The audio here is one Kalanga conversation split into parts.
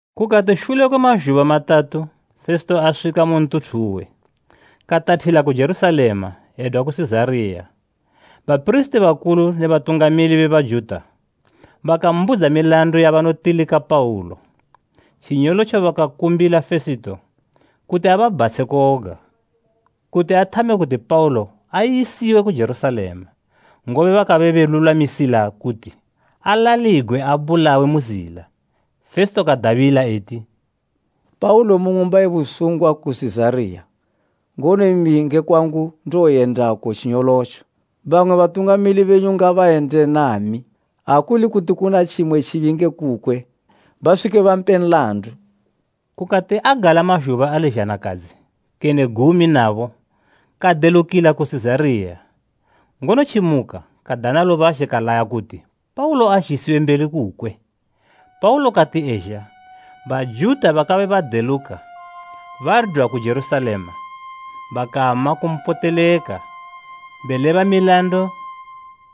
Kukati shule kwe mazhuba matatu Fesito aswika mu ntuthu uwe, katathila ku Jerusalema edwa ku Sizariya. Bapirisiti bakulu ne batungamili be Bajuta bakambudza milandu yabanotilika Paulo. Tjinyolotjo bakakumbila Fesito, kuti ababhatshe koga, kuti athame kuti Paulo ayisiwe ku Jerusalema, ngobe bakabe belulwamisila kuti alaligwe abulawe mu zila. Fesito kadabila eti, “Paulo umu ng'umba ye busungwa ku Sizariya, ngono imi nge kwangu ndowoyendako tjinyolotjo. Bamwe batungamili benyu ngabayende nami, ha kuli kuti kuna tjimwe tjibi nge kukwe, baswike bampe nlandu.” Kukati agala mazhuba ali zhanakadzi kene gumi nabo kadelukila ku Sizariya, ngono tjimuka kadana lubazhe kalaya kuti Paulo azhisiwe mbeli kukwe. Paulo kati ezha, Bajuta bakabe badeluka badwa ku Jerusalema bakama kumpoteleka beleba milandu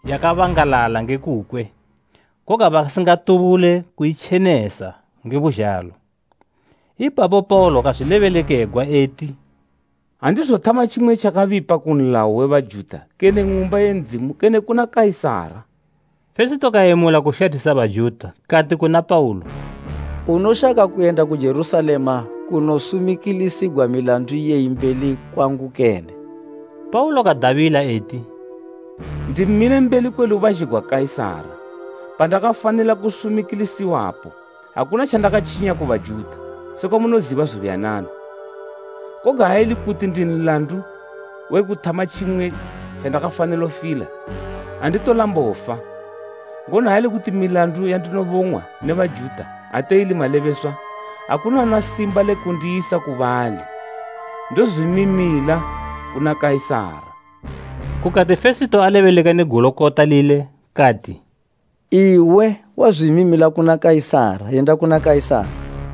yakabangalala nge kukwe, koga basingatubule kuitjenesa nge buzhalo. Ipapo Paulo kazwilebelekegwa eti, “Andizothama tjimwe tjakabipa ku nlayo we Bajuta kene Ng'umba ye Ndzimu kene kuna Kaisara.” Fesito kayemula kushathisa Bajuta kati kuna Paulo, “Unoshaka kuyenda ku Jerusalema kunosumikilisigwa milandu iyeyi mbeli kwangu kene?” Paulo kadabila eti, “Ndimile mbeli kwe lubazhe gwa Kaisara, pandakafanila kusumikilisiwapo. Akuna tjandakatjinya ku Bajuta, sekwa munoziba zubuyanana. Koga ha ili kuti ndi nlandu we kuthama tjimwe tjandakafanilo fila, anditolambo fa, ngono ha ili kuti milandu yandinobong'wa ne Bajuta ate ili malebeswa, akuna una simba le kundiyisa ku bali. Ndozwimimila kuna Kaisara!” Kukati Fesito alebeleka ne Gulukota lile kati, “Iwe wazwimimila kuna Kaisara, yenda kuna Kaisara!”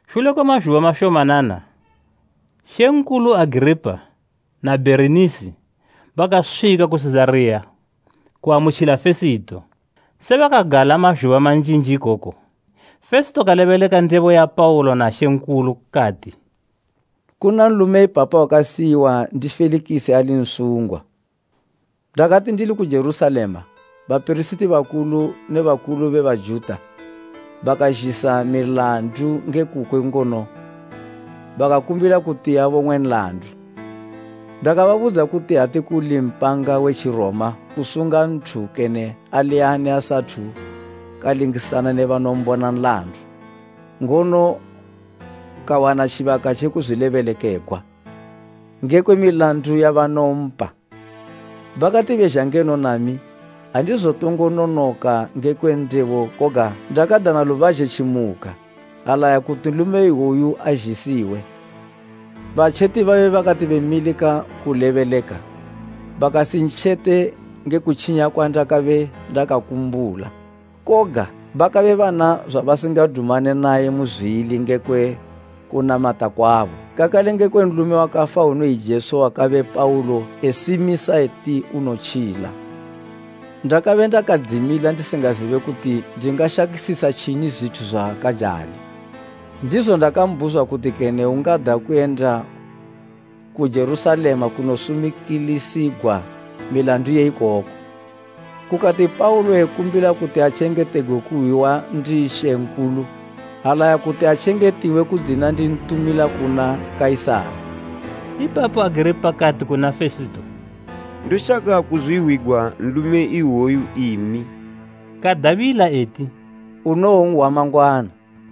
Shule kwe mazhuba mashomanana mambo Agiripa na Bherinisi bakaswika ku Sizariya kuamutjila Fesito. Se bakagala mazhuba manjinji ikoko, Fesito kalebeleka ndebo ya Paulo na mambo. Kati, “Kuna nlume ipapa wakasiyiwa ndi Felikisi ali nsungwa. Ndakati ndili ku Jerusalema, bapirisiti bakulu ne bakulu be Bajuta bakazhisa milandu nge kukwe ngono bakakumbila kuti abong'we nlandu. Ndakababudza kuti ate kuli mpanga we Tjiroma kusunga nthu kene ali ani asathu kalingisana ne banombona nlandu ngono kawana tjibaka tje kuzwilebelekegwa ngekwe milandu yabanompa. Bakati bezha ngeno nami, andizotongo nonoka ngekwe ndebo koga ndakadana lubazhe tjimuka, alaya kuti nlume iwoyu azhisiwe. Batjeti babe bakati bemilika kulebeleka, bakasintjete nge kutjinya kwandakabe ndakakumbula. Koga, bakabe bana zwabasingadumane naye muzwili ngekwe kunamata kwabo, kakale ngekwe nlume wakafa unoyi Jesu wakabe Paulo esimisa eti unotjila. Ndakabe ndakadzimila ndisingazibe kuti ndingashakisisa tjini zwithu zwakajali; ndizo ndakambhuzwa kuti kene ungada kuyenda ku Jerusalema kunosumikilisigwa milandu iyeyi ikoko. Kukati Paulo ekumbila kuti atjengetegwe kuhwiwa ndi mambo, alaya kuti atjengetiwe kudzina ndintumila kuna Kaisara.” Ipapo Agiripa kati kuna Fesito, “Ndoshaka kuzwihwigwa nlume iwoyu imi.” Kadabila eti, “Unowonhwa mangwana.”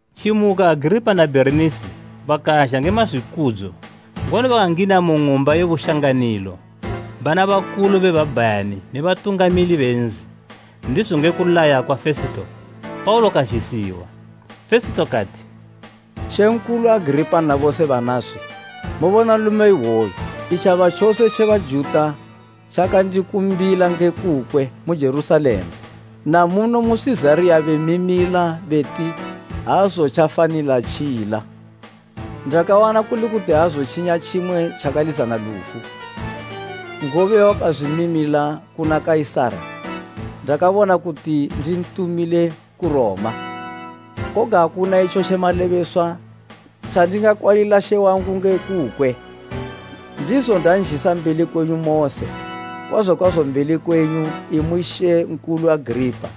Tjimuka Agiripa na Bherinisi bakazha nge mazwikudzo ngono bakangina mu ng'umba ye bushanganilo bana bakulu be babhayani ne batungamili be nzi. Ndizo nge kulaya kwa Fesito Paulo kazhisiwa. Fesito kati, “Mambo Agiripa na bose banaswi, mobona nlume iwoyu! Itjaba tjose tje Bajuta tjakandikumbila nge kukwe mu Jerusalema na muno mu Sizariya bemimila beti aazotjafanilo tjila. Ndakawana kuli kuti aazotjinya tjimwe tjakalizana lufu, ngobe wakazwimimila kuna Kaisara, ndakabona kuti ndintumile ku Roma. Koga akuna itjo tje malebeswa tjandingakwalila she wangu nge kukwe. Ndizo ndanzhisa mbeli kwenyu mose, kwazo kwazo mbeli kwenyu, imwi Mambo Agiripa,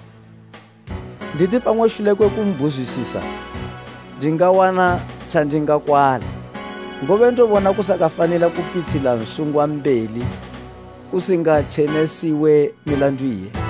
nditi pamwe shule kwe kumbhuzwisisa ndingawana tjandingakwala. Ngobe ndobona kusakafanila kupitshila nsungwa mbeli kusingatjenesiwe milandu iye.”